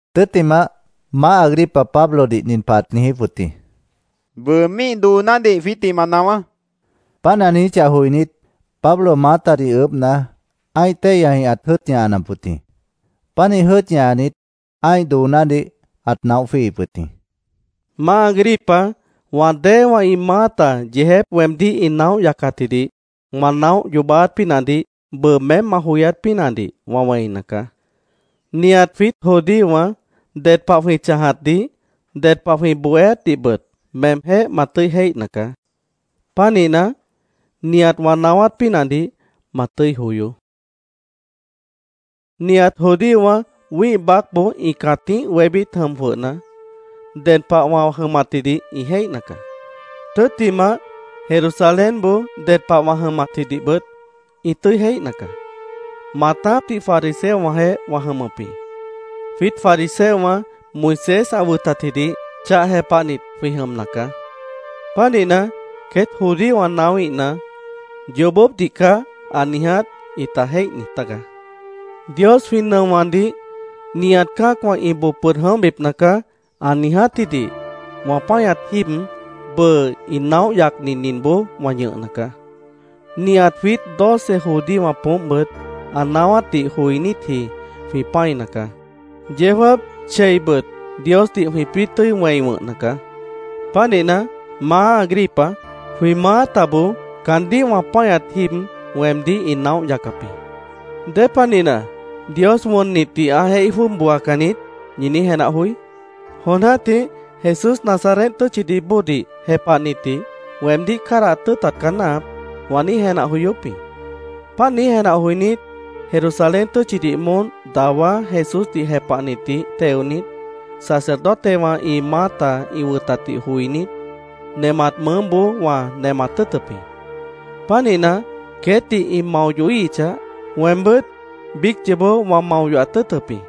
Tʉ́ttimah, Maáh Agripa Pablodih nin pah ãt niijíp wʉt jĩ: —Bʉʉ míih doonádih jwiítdih ma naáwá, ãt niijíp wʉt jĩ. Páant ã niijíchah joinít, Pablo maátadih ʉʉ́bhna, ã́ih téihyajĩh ãt jʉ́ʉt ñahanap wʉt jĩ. Pánih jʉ́ʉt ñahanit, ã́ih doonádih ãt naóh jwíihip wʉt jĩ. “Maá Agripa, wã déewã ĩ maáta yeejép weemdíh ĩ naóh yacatjidih wã naóh yoobáát pínahdih bʉʉ meém ma joyát pínahdih wã wẽina caá. Nihat jwiít judíowã ded pah jwĩ chãjatdih, ded pah jwĩ bohéátdihbʉt meemjéh ma tʉ́i jéihna caá. Pánihna, nihat wã naáwát pínahdih ma tʉ́i joyoó”, Pablo ãt niijíp wʉt jĩ. “Nihat judíowã wĩ́ih baácboó ĩ cãtíh wébít jʉm jwʉhna, ded pah wã jʉmatjidih ĩ jéihna caá. Tʉ́ttimah, Jerusalénboó ded pah wã jʉmatjidihbʉt ĩ tʉ́i jéihna caá. Maatápdih fariseowãjeéh wã jʉmʉp jĩ. Jwiít fariseowã Moisés ã wʉtatjidih chah jepahnit jwĩ jʉmna caá. Pánihna, queét judíowã naáwíhna, ‘Yoobópdih caá ã niiját’, ĩta jéih niij tágaá. Dios jwĩ nʉowãdih ‘Nihat cã́acwã ĩ boo pʉd jʉ̃óhbipna caá’, ã niijátjidih wã páñat jíib, bʉʉ ĩ naóh yacni ninboó wã ñʉhna caá. Nihat jwiít doce judíowã poómpbʉt ã naáwátdih joinítji jwĩ pã́ina caá. Yeó jáap, cheibʉt Diosdih jwĩpĩ́ tʉ́i wẽi wʉ̃hna caá. Pánihna, Maá Agripa, jwĩ maátaboó caandíh wã páñat jíib weemdíh ĩ naóh yacap jĩ. ¿Dépanihna ‘Dios wʉnnitdih ã jéih jwʉ́ʉb booacan niít’, ñi niíj jenah joí? “Jon jã́tih ‘Jesús Nazaret tʉ́tchidih bóodih jepahnitdih weemdíh cádahat tʉ́ʉtat caá náahap’, wã niíj jenah joyóp jĩ. Páant niíj jenah joinít, Jerusalén tʉ́tchidih moón dawá Jesúsdih jepahnitdih teonit, sacerdotewã ĩ maáta ĩ wʉtatdih joinít, nemat mʉʉ́boó wã nemat tʉ́ʉtʉp jĩ. Pánihna, queétdih ĩ mao yohíhichah, weembʉ́t biíc yoobó wã mao yohat tʉ́ʉtʉp jĩ.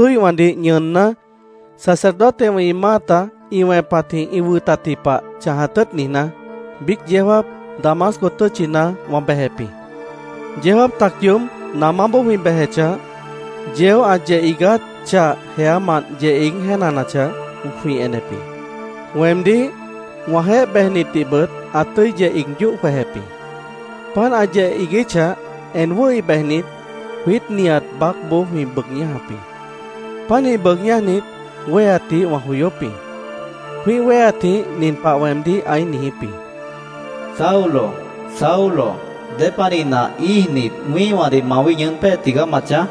“Pánih Jesúíhwãdih ñʉʉnná, sacerdotewã ĩ maáta ĩ wẽpatjĩh ĩ wʉtatji pah chãjat tʉ́ʉt niijná, biíc yeó jáap Damasco tʉ́tchina wã bejep jĩ. Yeó jáap tac yoób namáboó jwĩ bejechah, yeó ã yeh iigát chah jeámant yeh iíg jéenanachah, jwĩ enep jĩ. Weemdíh, wãjeéh bejnitdihbʉt ã tʉ́i yeh iig yóh jwejep jĩ. Páant ã yeh iiguíchah, en wʉ́hi bejnit, jwiít nihat baácboó jwĩ bʉʉg ñájap jĩ. Pánih bʉʉg ñájnit, wéheatdih wã joyóp jĩ. Jwĩ́ih wéheatjĩh nin pah weemdíh ãí niijíp jĩ: ‘Saulo, Saulo, ¿Dépanihna íijnit, wĩ́ihwãdih mawíh ñʉʉ́n pée tigaá ma chãj?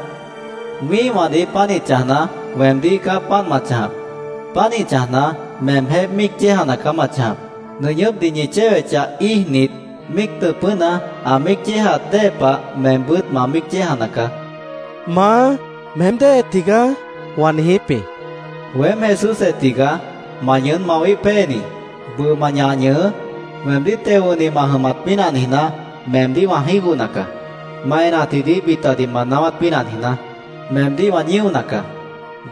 Wĩ́ihwãdih pánih chãjna, weemdíh caá páant ma chãjap. Pánih chãjna, meemjéh míic yéejana caá ma chãjap. Nʉñʉ́pdih ñi chéwechah, íijnit, míic tʉ̃pʉ́na, ã míic yéejaat dée pah meembʉ́t ma míic yéejana caá’, ã niijíp jĩ. ‘¿Maá, meém déhe tigaá?’ wã niijíp jĩ. ‘Weém Jesúsjeh tigaá, ma ñʉʉ́n mawíh péeni. Bʉʉ ma ñah ñʉhʉʉ́. Weemdíh teo wʉ̃hni ma jʉmat pínah niijná, meemdíh wã jígohna caá. Ma enatjidih bitadih ma naáwát pínah niijná, meemdíh wã ñíona caá.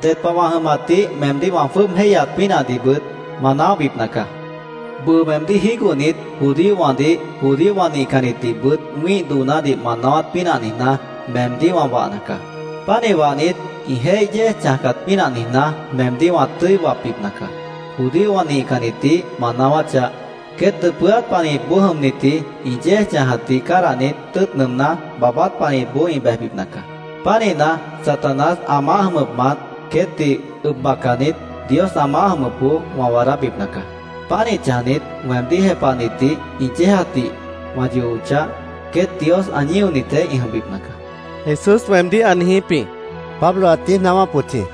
Ded pah wã jʉmatdih meemdíh wã jwʉ́ʉb jéihyaat pínahdihbʉt ma naóhbipna caá. Bʉʉ meemdíh jígohnit, judíowãdih, judíowã nihcannitdihbʉt wĩ́ih doonádih ma naáwát pínah niijná, meemdíh wã wahna caá. Pánih wahnit, ĩ jéih yéej chãjcat pínah niijná, meemdíh wã tʉ́i wapbipna caá. Judíowã nihcannitdih ma naáwáchah, queét dʉpʉ́át panihipboó jʉmnitji ĩ yéej chãjatdih cádahnit tʉ́ʉt nʉʉmná, baabát panihipboó ĩ bejbipna caá. Pánihna, Satanás ã maáh jʉmʉpmant queétdih ʉb bacanit, Dios ã maáh jʉmʉpboó wã waadábipna caá. Pánih chãjnit, weemdíh jepahnitdih ĩ yéejatdih wã yohochah, queét Dios ã ñíonitjeéh ĩ jʉmbipna caá’, Jesús weemdíh ã niijíp jĩ”, Pablo ãt niíj naáwáp wʉt jĩ.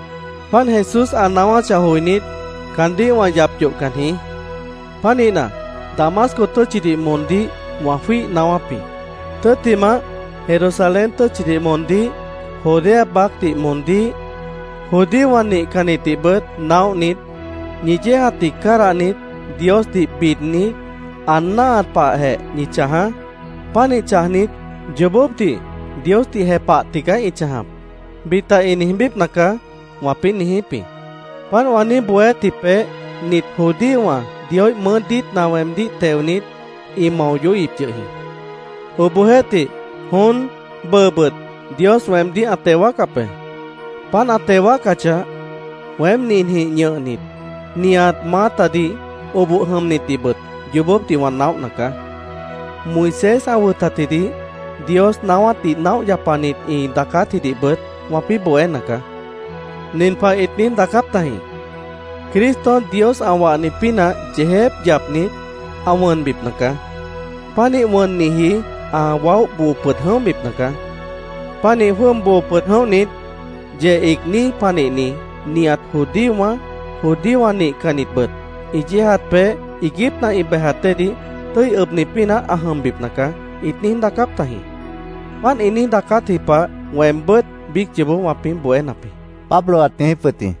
“Páant Jesús ã naáwáchah joinít, caandíh wã yap yohcan jĩí. Pánihna, Damasco tʉ́tchidih moondíh wã jwíih naáwáp jĩ. Tʉ́ttimah, Jerusalén tʉ́tchidih moondíh, Judea baácdih moondíh, judíowã nihcannitdihbʉt naóhnit, ‘Ñi yéejatdih cádahnit, Diosdih bidnit, ã náahat pahjeh ñi chãjaá. Pánih chãjnit, “Yoobópdih Diosdih jepah tigaá ĩ chãjap”, bita ĩ niijbípna caá’, wãpĩ́ niijíp jĩ. Páant wã niíj bohéátji peéh nit judíowã Dioíh mʉʉ́ diítna weemdíh teonit, ĩ mao yohíhip yʉh jĩ. Obohjeéhtih, jon, bʉʉbʉt Dios weemdíh ã teo wáacap be. Páant ã teo wáacachah, weém ninjĩh ñʉhnit, nihat maátadih, oboh jʉmnitdihbʉt yoobópdih wã naóhna caá. Moisés ã wʉtatjidih, Dios naáwátdih naóh yapanit ĩ daacátjidihbʉt wãpĩ́ bohéna caá. Nin pah ĩt niíj daacáp tajĩ: ‘Cristo Dios ã wahni pínah yeejép yapnit, ã wʉnbipna caá. Pánih wʉnniji, ã waóh boo pʉd jʉ̃óhbipna caá. Pánih jwʉ́ʉb boo pʉd jʉ̃óhnit, yeh iigní panihni nihat judíowã, judíowã nihcannitbʉt ĩ yéejat peéh iiguípna ĩ bejat déedih tʉ́i ʉbni pínah ã jʉmbipna caá’, ĩt niíj daacáp tajĩ. Páant ĩ niíj daacátji pah weembʉ́t biíc yoobó wãpĩ́ bohénap jĩ”, Pablo ãt niijíp wʉt jĩ.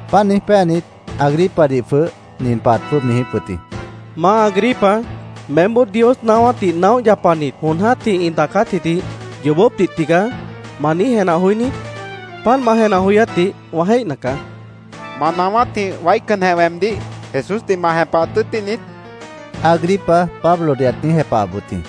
Páant niíj péanit, Agripadih jwʉh nin pah ãt jwʉ́ʉb niijíp wʉt jĩ: —Maá Agripa, meémboó Dios naáwátdih naóh yapanit jon jã́tih ĩ daacátjidih ‘Yoobópdih tigaá’, ¿ma niíj jenah joí niít? Páant ma jenah joyátdih wã jéihna caá, ãt niijíp wʉt jĩ. —¿Ma naáwátjĩh waícanjeh weemdíh Jesúsdih ma jepahat tʉ́ʉtíh niít? Agripa Pablodih ãt niíj jepahap wʉt jĩ.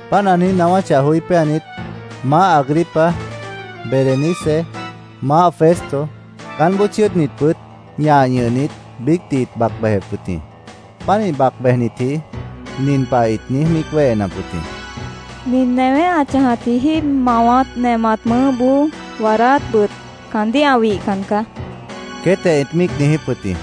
Páant ã naáwáchah joí péanit, Maáh Agripa, Berenice, Maáh Festo, caánboó chʉ́ʉdnitbʉt ñah ñʉhnit, biícdih ĩt bac bejep wʉt jĩ. Pánih bac bejnitji nin pah ĩt niíj míic wéhenap wʉt jĩ: —Nin newé ã chãjatji jíib, mawat, nemat mʉʉ́boó waadáátbʉt caandíh ã wihcan caá, queétjeh ĩt míic niijíp wʉt jĩ.